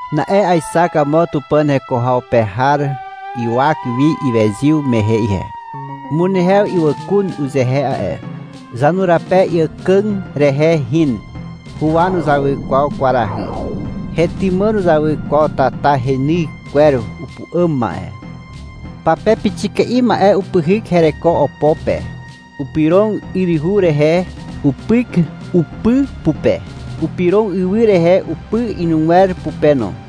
Na'e aexak amo Tupàn heko haw pe har ywak wi iwezyw mehe ihe. Umunehew ywàkun uzehe a'e. Zanurape iàkà rehe hin. Huwa nuzawy kwaw kwarahy. Hetymà nuzawy kwaw tata reny kwer upu'àm ma'e. Pape pixika'i ma'e upyhyk hereko opo pe. Upyrog yryhu rehe upyk upy pupe. Upyrog ywy rehe upy inugwer pupe no.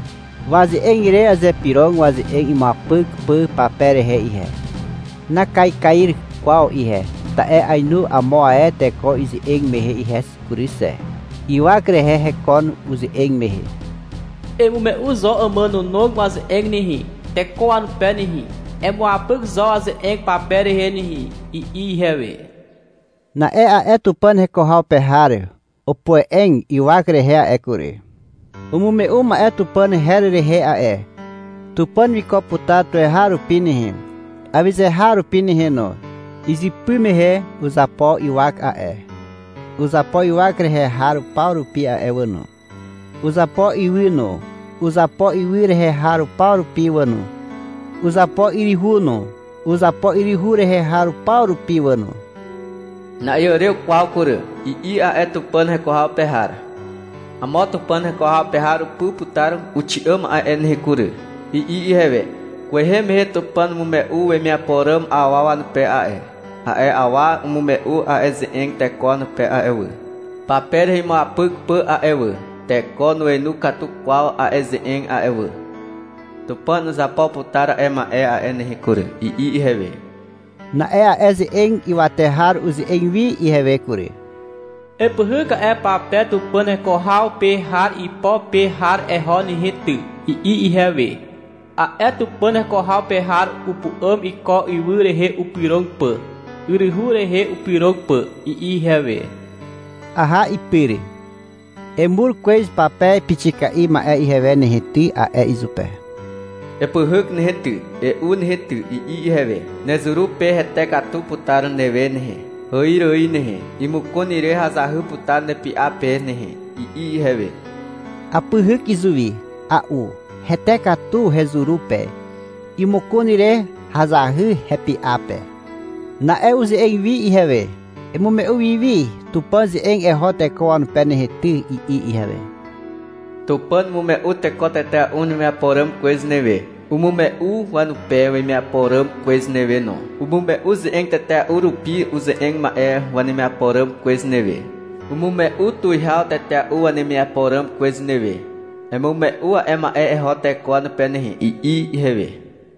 Waze'eg ire azypyrog waze'eg imuapyk pà pape rehe ihe. Nakaikair kwaw ihe, ta'e ainu amo ae teko ize'eg mehe ihe kury xe. Ywak rehe hekon uze'eg mehe. — Emume'u zo àmànànog waze'eg nehe, teko wanupe nehe. Emuapyk zo waze'eg pape rehe nehe, i'i ihewe. Na'e a'e Tupàn heko haw pe har opoe'eg ywak rehe a'e kury. Umume'u ma'e Tupàn her rehe a'e. (Tupàn wiko putar tuweharupi nehe, awyze har rupi nehe no. Izypy mehe uzapo ywak a'e. Uzapo ywak rehe har paw rupi a'e wà no. Uzapo ywy no, uzapo ywy rehe har paw rupi wà no. Uzapo yryhu no, uzapo yryhu rehe har paw rupi wà no.) — Na'iàrew kwaw kury, i'i a'e Tupàn heko haw pe har. — Amo Tupàn heko haw pe har upy putar uxi'àm a'e nehe kury, i'i ihewe. — Kwehe mehe Tupàn umume'u wemiapo ràm awa wanupe a'e. A'e awa umume'u a'e ze'eg teko wanupe a'e wà, pape rehe imuapyk pà a'e wà. Teko nuenu katu kwaw a'e ze'eg a'e wà. Tupàn uzapo putar a'e ma'e a'e nehe kury, i'i ihewe. Na'e a'e ze'eg ywate har uze'eg wi ihewe kury. — Epyhyk a'e pape Tupàn heko haw pe har ipo pe har eho nehe ty, i'i ihewe. (— A'e Tupàn heko haw pe har upu'àm iko ywy rehe upyrog pà, yryhu rehe upyrog pà, i'i ihewe.) Aha ipyr. — Emur kwez pape pixika'i ma'e ihewe nehe ty, a'e izupe. — Epyhyk nehe ty, e'u nehe ty, i'i ihewe. — Nezuru pe hete katu putar newe nehe, hàir ài nehe. Imokon ire hazahy putar nepy'a pe nehe, i'i ihewe. Apyhyk izuwi. A'u. Hete katu hezuru pe. Imokon ire hazahy hepy'a pe. Na'e uze'eg wi ihewe. — Emume'u wi wi Tupàn ze'eg eho teko wanupe nehe ty, i'i ihewe. — Tupàn umume'u teko tetea'u wanemiapo ràm kwez newe. Umume'u wanupe wemiapo ràm kwez newe no. Umume'u ze'eg tetea'u rupi uze'eg ma'e wanemiapo ràm kwez newe. Umume'u tuwihaw tetea'u wanemiapo ràm kwez newe. Emume'u a'e ma'e eho teko wanupe nehe, i'i ihewe.